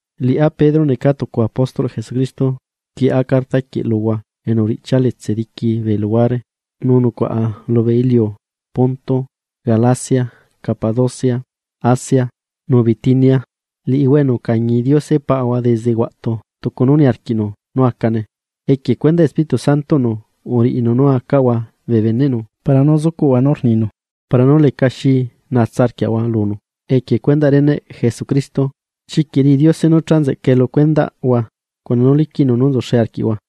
Liꞌá Pedro neca tucu apóstol Jesucristo, rquieꞌa carta quieꞌ luhua enu uriꞌchia letse diqui bee luhuare, nu nucuaꞌa lubee iliu Ponto, Galacia, Capadocia, Asia nu Bitinia, liꞌihua enu ucañi Diose Paꞌahua desde huaꞌtu tucu nu niarquiꞌnu nú acane. Equie cuendaꞌ Espíritu Santoꞌnu uriꞌinu nú acaꞌahua bee beneꞌnu para nú zucuꞌhua nú rninu para nú lecaxi nahua lunu equie cuenda reneꞌ Jesucristo. Chiquiꞌ riꞌi Diose nú cha nzeꞌca lu cuendaꞌhua cuna nu liquiꞌnu nú nzuxe arquiꞌhua.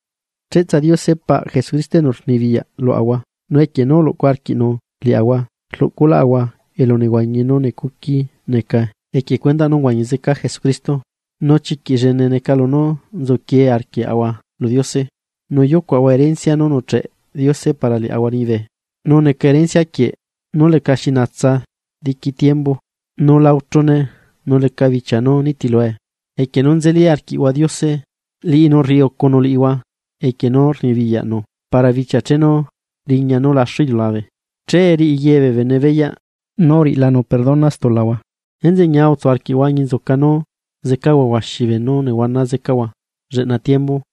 Cheꞌtsa Diose paꞌ Jesucristo enu rnibiyaꞌ luaꞌahua nú equie nu uluꞌcu arquiꞌnu liaꞌahua rluꞌculaꞌahua elu nehuañi nú necuqui neca equie cuendaꞌ nú uhuañi zeca Jesucristo, nu chiquiꞌ llene neca lunú nzuquie arquiaꞌahua lu Diose, nú yucuaꞌahua rencia nú nucheꞌe Diose para liaꞌahua liñibe, nu neca rencia quieꞌ nú lecaxi na diqui tiembu, nu la uchune nu leca bichia nú nitilue. Equie nu nzeli arquiꞌhua Diose, liꞌinu rriucunu liꞌihua cuna poderꞌnu para bichia chenu riña nú laxu iliulabe, che riꞌi ye bee bene beyaꞌ nú uriꞌilanu perdona stulahua. Enzeꞌe ñia utsu arquiꞌhua, añinzuca nú zecahua huaxilu beenú nehuana zecahua lleꞌna tiembu.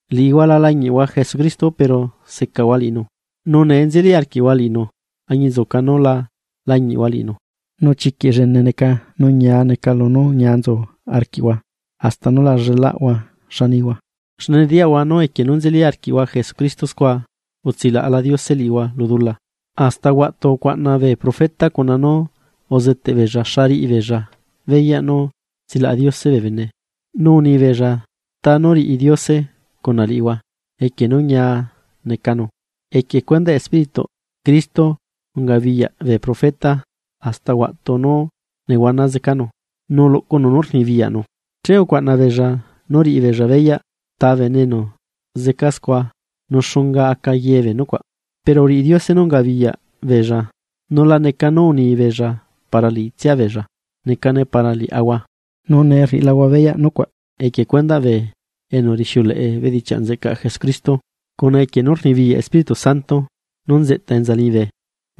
Liꞌihua la lañiꞌhua Jesucristo pero secahua liꞌinu, nu nee nzeli arquiꞌhua liꞌinu añinzuca nú la lañiꞌhua liꞌinu, nu chiquiꞌ llene neca nu ñia neca lunú ñia nzu arquiꞌhua hasta nú la llelaꞌhua xa nihua, xne nediyaꞌhua nú equie nú nzeli arquiꞌhua Jesucristo scua, utsilaꞌla Diose liꞌihua lu dula. Hasta huaꞌtu ucuaꞌna bee profeta cuna nú uzeteꞌ beella xa riꞌi beella beyaꞌ nú tsilaꞌa Diose bee bene, nu uni beella ta nú riꞌi Diose cuna liꞌihua equie nú ñia necanu. Equie cuendaꞌ Espírituꞌ Cristo ungabiyaꞌ bee profeta hasta huaꞌtu nú nehuana zecanu, nu luꞌcunu nú rnibiyaꞌnu, che ucuaꞌna beella nú riꞌi beella beyaꞌ ta bene enu zeca scua nu xunga aca ye bee nucuaꞌ. Pero uriꞌi Diose nú ungabiyaꞌ beella nu la neca nú uni beella para liꞌitsia beella, necane para liaꞌahua. Nu nee rriꞌilahua beyaꞌ nucuaꞌ equie cuendaꞌ bee enu rixiuleꞌe bedichiaꞌ nzeꞌcaꞌ Jesucristo cuna equie nú rnibiyaꞌ Espíritu Santo nú nzeꞌta enza liñibe.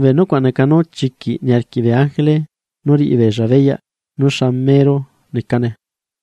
Bee nucuaꞌ neca nú chiquiꞌ niarquiꞌ bee ángele nú riꞌi beenu beyaꞌ nú xa mero necane.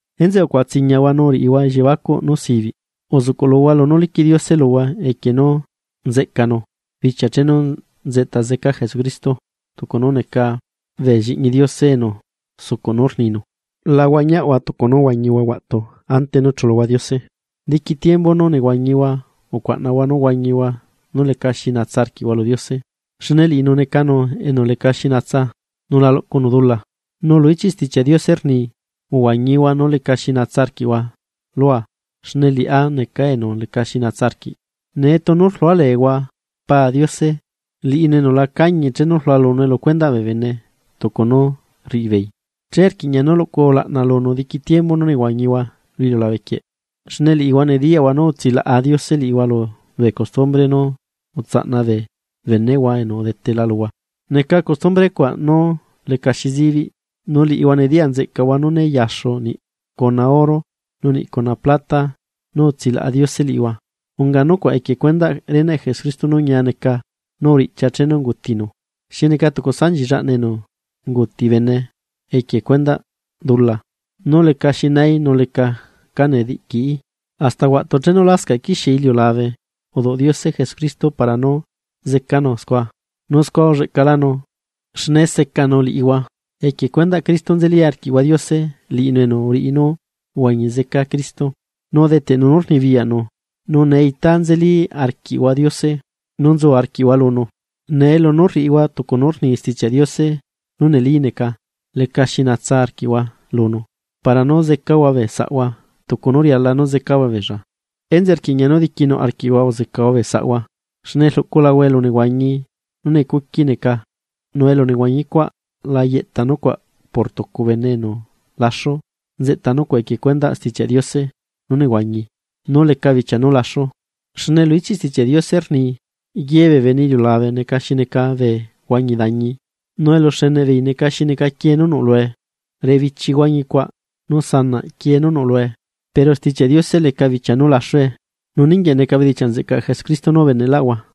Enzeꞌe ucuaꞌatsiñahua nu riꞌihua elliebacuꞌ nú sibiꞌ, uzuꞌcuꞌluhua lunú liquiꞌ Diose luhua equie nú nzeꞌcanu bichia chenu nzeꞌta zeca Jesucristo. Tucu nú neca bee Lliꞌñi Diose enu sucuꞌ nú rninu, la huañiaꞌhua tucu nú uhuañihua huaꞌtu ante nú chuluhua Diose. Diqui tiembu nú nehuañihua ucuaꞌnahua nú huañihua nú lecaxi natsa arquiꞌhua lu Diose, xne liꞌinu necanu enu leca xi natsa, nu la luꞌcunu dula. Nu lu ichiꞌ Stichiaꞌ Diose rni: “Uhuañihua nú lecaxi natsa arquiꞌhua lua, xne liꞌá neca enu lecaxi natsa arquiꞌ.” Nee tunu rlualeehua “Paa” Diose, liꞌinu enu la cañi chenu rlualunue lu cuendaꞌ bee bene tucu nú rriꞌi beei, enzeꞌe rquiꞌña nú luꞌcuhua ulaꞌna lunu diqui tiembu nú nehuañihua lu iliulabe quieꞌ. Xne liꞌihua nediyaꞌhua nú utsilaꞌa Diose liꞌihua lubee costumbre nú utsaꞌna bee beneꞌhua enu udetela luhua, neca costumbre cuaꞌ nú lecaxi zibiꞌ, nu liꞌihua nediyaꞌ nzeꞌcaꞌhua nú né yaxu niꞌ cuna oro nu niꞌ cuna plata nú utsilaꞌa Diose liꞌihua. Unga nucuaꞌ equie cuendaꞌ reneꞌ Jesucristo nú ñia neca, nú uriꞌchia chenu ungutinu xi neca tucu sanchi llaꞌna enu unguuti bene equie cuendaꞌ dula, nu lecaxi naí nu leca cá nediꞌquií. Hasta huaꞌtu chenu lascaꞌ quixie iliulabe uduꞌ Diose Jesucristo para nú zecanu scua, nu scua ulleꞌcalanu, xne secanu liꞌihua. Equie cuendaꞌ Cristo nzeli arquiꞌhua Diose, liꞌinu enu uriꞌi nú uhuañi zeca Cristo, nu udeteꞌnu nú rnibiyaꞌnu, nu nee itá nzeli arquiꞌhua Diose nu nzu arquiꞌhua lunu. Nee lunú rriꞌihua tucu nú rni Stichiaꞌ Diose nú neli neca, lecaxi natsa arquiꞌhua lunu para nú zecahua bee saꞌhua tucu nú riala nú zecahua beella, Enzeꞌe rquiꞌña nú diquinuꞌ arquiꞌhua uzecahua bee saꞌhua. Xne rluꞌculahua elu nehuañi nú necuqui neca nu elunehuañi cuaꞌ la yeꞌta nucuaꞌ por tucu bene enu laxu, nzeꞌta nucuaꞌ equie cuendaꞌ Stichiaꞌ Diose nú nehuañi nu leca bichia nú laxu. Xne lu ichiꞌ Stichiaꞌ Diose rni: Ye bee bene iliulabe neca xi neca bee huañi dañi, nu eluxeneꞌ beei neca xi neca quiee nú nuꞌ lue. Ribichi huañicuaꞌ nu sanaꞌ quiee nú nuꞌ lue; pero Stichiaꞌ Diose leca bichia nú laxue. Nu ninguieꞌ neca bedichiaꞌ nzeꞌcaꞌ Jesucristo nú ubeneꞌlaꞌhua.